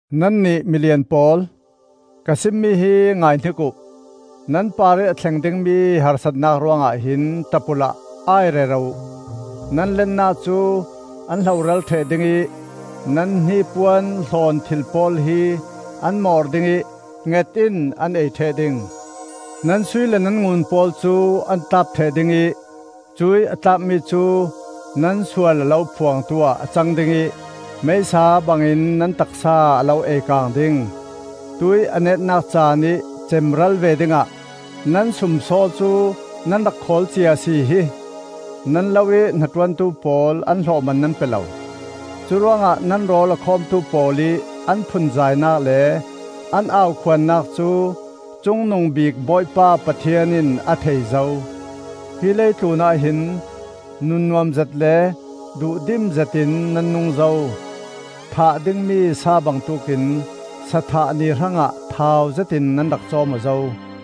Nannih milian pawl, ka simmi hi ngaihnik uh! Nan parih a thleng dingmi harsatnak ruangah hin ṭap uhla ai rero uh. Nan lennak cu an hloral ṭheh ding ih nan hnipuan hlawnthil pawl hi an mawr ding ih nget in an ei ṭheh ding. Nan sui le nan ngun pawl cu an tlap ṭheh ding ih cuih a tlapmi cu nan sual a lo phuangtu ah a cang ding ih meisa bangin nan taksa a lo ei-kaang ding. Tuih a netnak caanih cemral ve dingah nan sumsaw cu nan rak khawl cia a si hi! Nan lo ih hnaṭuantu pawl an hlawhman nan pe lo. Curuangah nan rawl a khawmtu pawl ih an phunzainak le an aukhuannak cu Cungnungbik Bawipa Pathian in a thei zo. Hi leitlunah hin nunnuamzet le duhdimzet in nan nung zo. Thah dingmi sa bangtuk in sa thah ni hrangah thauzet in nan rak cawm aw zo.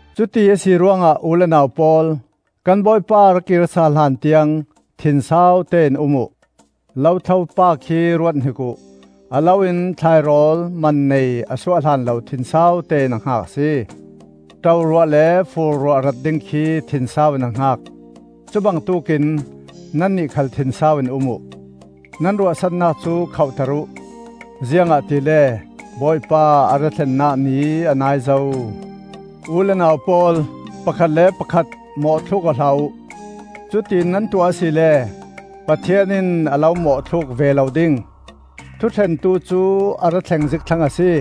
Cuti a si ruangah u le nau pawl, kan Bawipa a ra kir sal hlan tiang thinsaute in um uh. Lothlo pa khi ruathnik uh! A lo in thlairawl man nei a suah hlanlo thinsaute in a hngak a si. Ṭoruah le fur ruah rat ding khi thinsau in a hngak. Cubangtuk in nannih khal thinsau in um uh. Nan ruahsannak cu khohter uh. Ziangahtile Bawipa a ra thlennak ni a nai zo. U le nau pawl, pakhat le pakhat mawhthluk aw hlah uh. Cutiin nan tuah asile Pathian in a lo mawhthluk ve lo ding. Thuṭhentu cu a ra thleng zik thlang a si.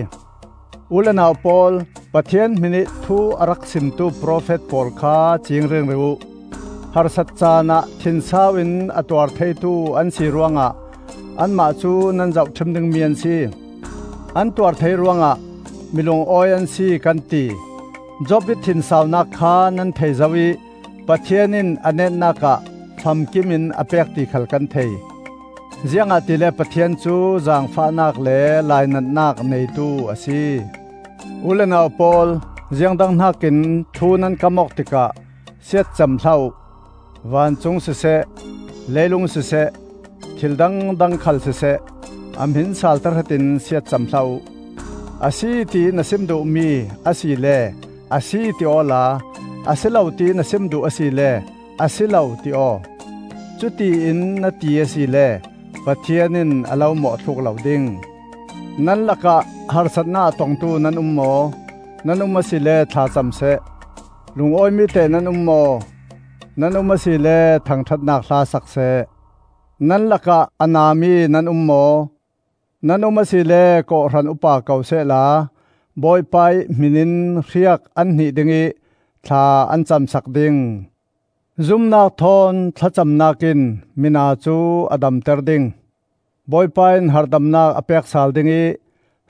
U le nau pawl, Pathian hminih thu a rak simtu profet pawl kha ciing ringring uh. Harsat caanah thinsau in a tuar theitu an si ruangah anmah cu nan zohṭhim dingmi an si. An tuar thei ruangah mi lungawi an si, kan ti. Job ih thinsaunak kha nan thei zo ih Pathian in a netnak ah famkimin a pek ti khal kan thei. Ziangahtile Pathian cu zaangfahnak le lainatnak neitu a si. U le nau pawl, ziangdang hnakin thu nan kam awk tikah siatcam hlah uh. Vancung siseh, leilung siseh, thil dangdang khal siseh, a hmin sal tahratin siatcam hlah uh. A si tiih na sim duhmi asile ‘Asi,’ ti awla, asilo tiih na sim duh asile ‘Asilo,’ ti aw. Cutiin na ti asile Pathian in a lo mawhthluk lo ding. Nan lakah harsatnak a tongtu nan um maw? Nan um asile thla cam seh. Lungawimi teh nan um maw? Nan um asile thangṭhatnak hla sak seh. Nan lakah a nami nan um maw? Nan um asile kawhhran upa ko sehla Bawipa ih hmin in hriak an hnih dingih thla an cam sak ding. Zumnak thawn thlacamnak in mina cu a damter ding. Bawipa in harhdamnak a pek sal ding ih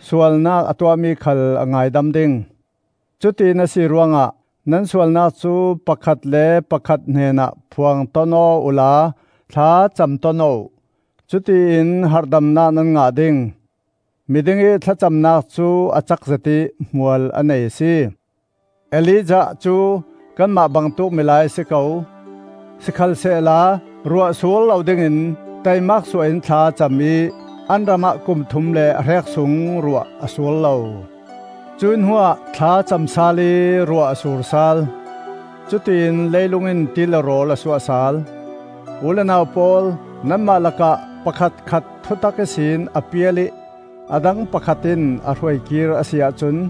sualnak a tuahmi khal a ngaidam ding. Cutiin a si ruangah nan sualnak cu pakhat le pakhat hnenah phuang ton aw uhla thlacam ton aw uh; cutiin harhdamnak nan ngah ding. Mi dingih thlacamnak cu a cak zet ih hmual a nei a si. Elijah cu kanmah bangtuk milai a si ko. Sikhalsehla ruah sur lo dingin taimak suah in thla a cam ih an ramah kum thum le a hrek sung ruah a sur lo. Cuih hnuah thla a cam sal ih ruah a sur sal. Cutiin leilung in ti le rawl a suah sal. U le nau pawl, nanmah lakah pakhatkhat thutak ihsin a pial ih a dang pakhat in a hruaikir a si ahcun,